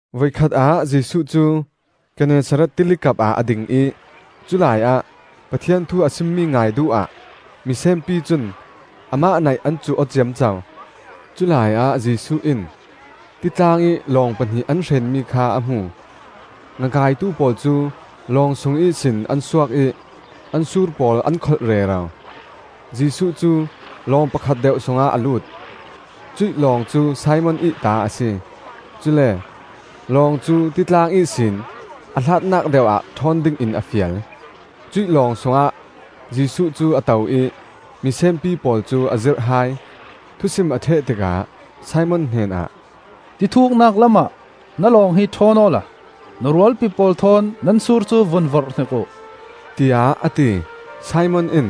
Voikhat ah Jesuh cu Gennesaret Tili kapah a ding ih culaiah Pathian thu a simmi ngai duh ah misenpi cun amah naih an cuh aw ciamco. Culai ah Jesuh in titlang ih lawng pahnih an hrenmi kha a hmu. Ngakaitu pawl cu lawng sung ihsin an suak ih an sur pawl an kholh rero. Jesuh cu lawng pakhat deuh sungah a lut; cuih lawng cu Simon ih ta a si; cule lawng cu titlang ihsin a hlatnak deuh ah ṭhawn dingin a fial. Cuih lawng sungah Jesuh cu a to ih misenpi pawl cu a zirh hai. Thusim a ṭheh tikah Simon hnenah, “Ti thuknak lamah na lawng hi ṭhawn awla na rualpi pawl thawn nan sur cu vun vorhhnik uh,” tiah a ti. Simon in,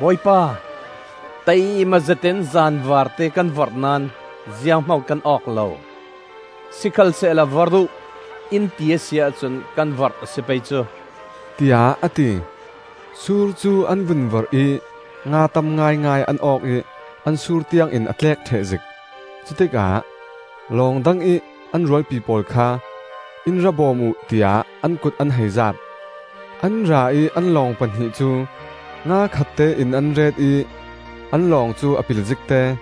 “Bawipa, taima zetin zanvarte kan vorh naón zianghman kan awk lo. Sikhalsehla vorh uh, in ti a si ahcun kan vorh a si pei cu,” tiah a ti. Sur cu an vun vorh ih nga tam ngaingai an awk ih an sur tiangin a tlek ṭhehzik. Cutikah lawng dangih an rualpi pawl kha, “In ra bawm uh,” tiah an kut an hei zaap. An ra ih an lawng pahnih cu nga khattein an ret ih an lawng cu a pil zikte.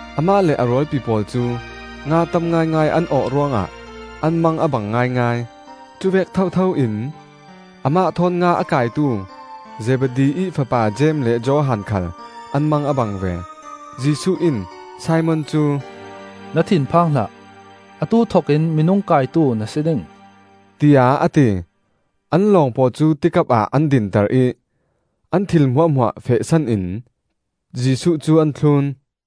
Amah le a rualpi pawl cu nga tam ngaingai an awh ruangah an mang a bang ngaingai. Cuvek thotho in amah thawn nga a kaitu Zebedi ih fapa Jeim le Johan khal an mang a bang ve. Jesuh in Simon cu, “Na thin phang hlah; atu thokin minung kaitu na si ding,” tiah a ti. An lawng pawl cu ti kapah an dinter ih an thil hmuahhmuah fehsan in Jesuh cu an thlun.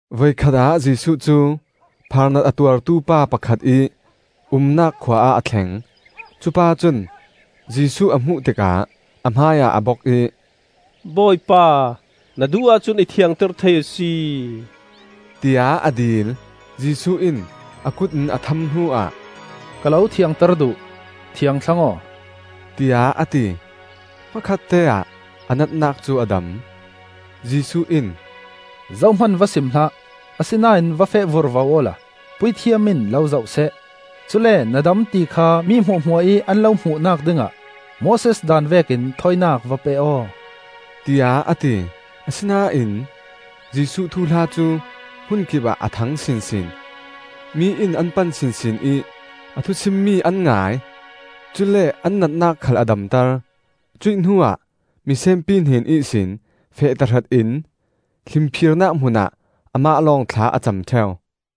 Voikhat ah Jesuh cu phaarnat a tuartu pa pakhat ih umnak khua ah a thleng. Cupa cun Jesuh a hmuh tikah a hmaiah a bok ih, “Bawipa, na duh ahcun i thiangter thei a si,” tiah a dil. Jesuh in a kut in a tham hnuah, “Ka lo thiangter duh, thiang thlang aw,” tiah a ti. Hmakhatteah a natnak cu a dam. Jesuh in, “Zohman va sim hlah, asinain va feh vurvo awla puithiam in lo zohseh; cule na dam ti kha mi hmuahhmuah ih an lo hmuhnak dingah Moses daan vekin thawinak va pe aw,” tiah a ti. Asinain Jesuh thuhla cu hmun kipah a thang sinsin, mi in an pan sinsin ih a thu simmi an ngai; cule an natnak khal a damter. Cuih hnuah misenpi hnen ihsin feh tahratin hlimphirnak hmunah amah lawng thla a cam ṭheu.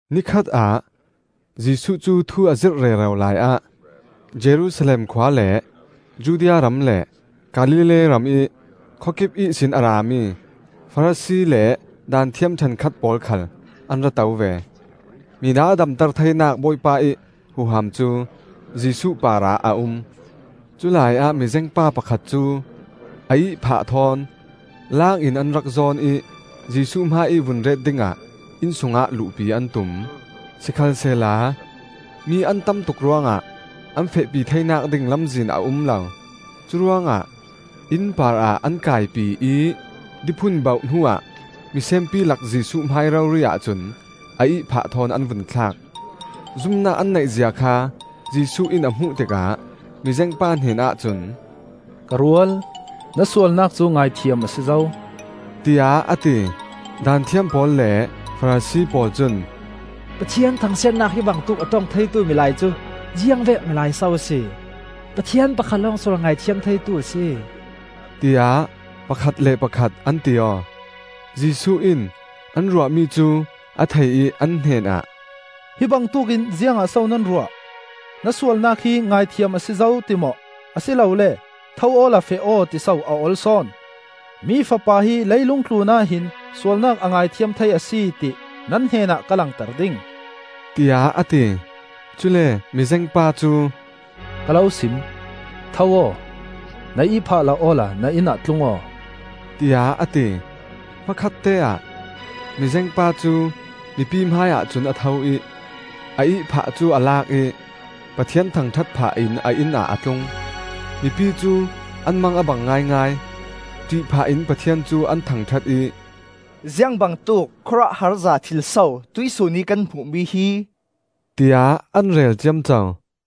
Nikhat ah Jesuh cu thu a zirh rero laiah Jerusalem khua le Judea ram le Galilee ramih khawkip ihsin a rami Farasi le Daanthiam ṭhenkhat pawl khal an ra to ve. Mina damter theinak Bawipa ih huham cu Jesuh parah a um. Culai ah mizengpa pakhat cu a ihphah thawn laangin an rak zawn ih Jesuh hmaiih vun ret dingah inn sungah luhpi an tum. Sikhalsehla mi an tamtuk ruangah an fehpi theinak ding lamzin a um lo. Curuangah inn parah an kaipi ih diphun bauh hnuah misenpi lak Jesuh hmai rori-ah cun a ihphah thawn an vun thlak. Zumnak an neihzia kha Jesuh in a hmuh tikah mizengpa hnenah cun, “Ka rual, na sualnak cu ngaithiam a si zo,” tiah a ti. Daanthiam pawl le Farasi pawl cun, “Pathian thangsiatnak hi bangtuk a ṭong theitu milai cu ziangvek milai so a si? Pathian pakhat lawng sual ngaithiam theitu a si,” tiah pakhat le pakhat an ti aw. Jesuh in an ruahmi cu a thei ih an hnenah, “Hi bangtuk in ziangah so nan ruah? ‘Na sualnak hi ngaithiam a si zo,’ ti maw, a si lole ‘Tho awla feh aw,’ tiso a ol sawn? Mi Fapa hi leilung tlunah hin sualnak a ngaithiam thei a si, ti nan hnenah ka langter ding,” tiah a ti. Cule mizengpa cu, “Ka lo sim: Tho aw! Na ihphah la awla na inn ah tlung aw,” tiah a ti. Hmakhatteah mizengpa cu mipi hmaiah cun a tho ih a ihphah cu a lak ih Pathian thangṭhat phah in a inn ah a tlung. Mipi cu an mang a bang ngaingai! ṭih phah in Pathian cu an thangṭhat ih, “Ziangbangtuk khawruahharza thil so tuihsun ih kan hmuh mi hi!” tiah an rel ciamco.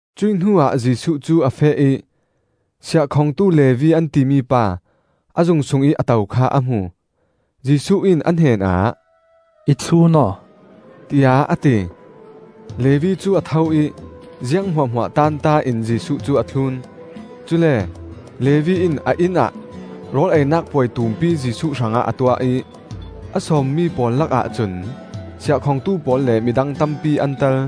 Cuih hnuah Jesuh cu a feh ih siahkhongtu Levi an timi pa a zung sungih a to kha a hmu. Jesuh in a hnenah, “I thlun aw,” tiah a ti. Levi cu a tho ih ziang hmuahhmuah taanta in Jesuh cu a thlun. Cule Levi in a inn ah rawl einak puai tumpi Jesuh hrangah a tuah ih a sawmmi pawl lakah cun siahkhongtu pawl le midang tampi an tel.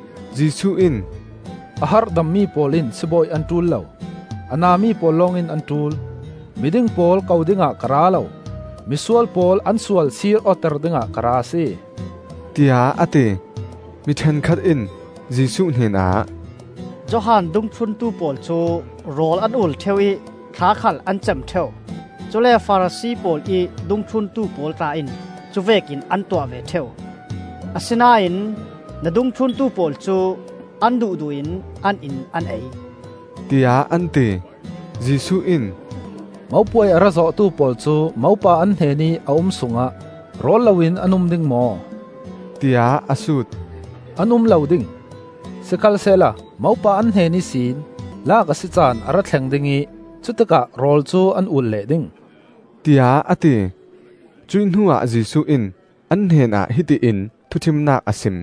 Jesuh in, “A harhdammi pawl in sibawi an ṭul lo, a nami pawl lawngin an ṭul. Miding pawl ko dingah ka ra lo; misual pawl an sual sir awter dingah ka ra a si,” tiah a ti. Mi ṭhenkhat in Jesuh hnenah, “Johan dungthluntu pawl cu rawl an ul ṭheu ih thla khal an cam ṭheu; cule Farasi pawl ih dungthluntu pawl tla in cuvekin an tuah ve ṭheu. Asinain na dungthluntu pawl cu an duhduh in an in an ei,” tiah an ti. Jesuh in, “Mopuai a ra zawhtu pawl cu mopa an hnenih a um sungah rawl loin an um ding maw?” tiah a sut. “An um lo ding! Sikhalsehla mopa an hnen ihsin laak a si caan a ra thleng ding ih cutikah rawl cu an ul leh ding,” tiah a ti. Cuih hnuah Jesuh in an hnenah hiti in thuṭhimnak a sim,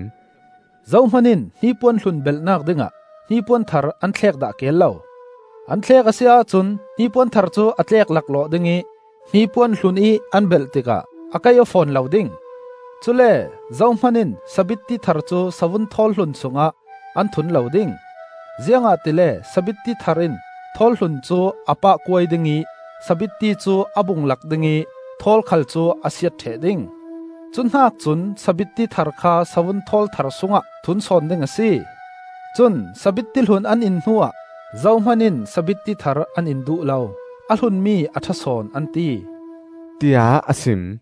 “Zohman in hnipuan hlun belhnak dingah hnipuan thar an thlek dah keel lo. An thlek a si ahcun hnipuan thar cu a tlek laklawh ding ih hnipuan hlunih an belh tikah a kaih aw fawn lo ding. Cule zohman in sabitti thar cu savun thawl hlun sungah an thun lo ding, ziangahtile sabitti thar in thawl hlun cu a pahkuai ding ih sabitti cu a bung lak ding ih thawl khal cu a siat ṭheh ding. Cu hnak cun sabitti thar kha savun thawl thar sungah thun sawn ding a si. Cun sabitti hlun an in hnuah zohman in sabitti thar an in duh lo. ‘A hlunmi a ṭha sawn,’ an ti,” tiah a sim.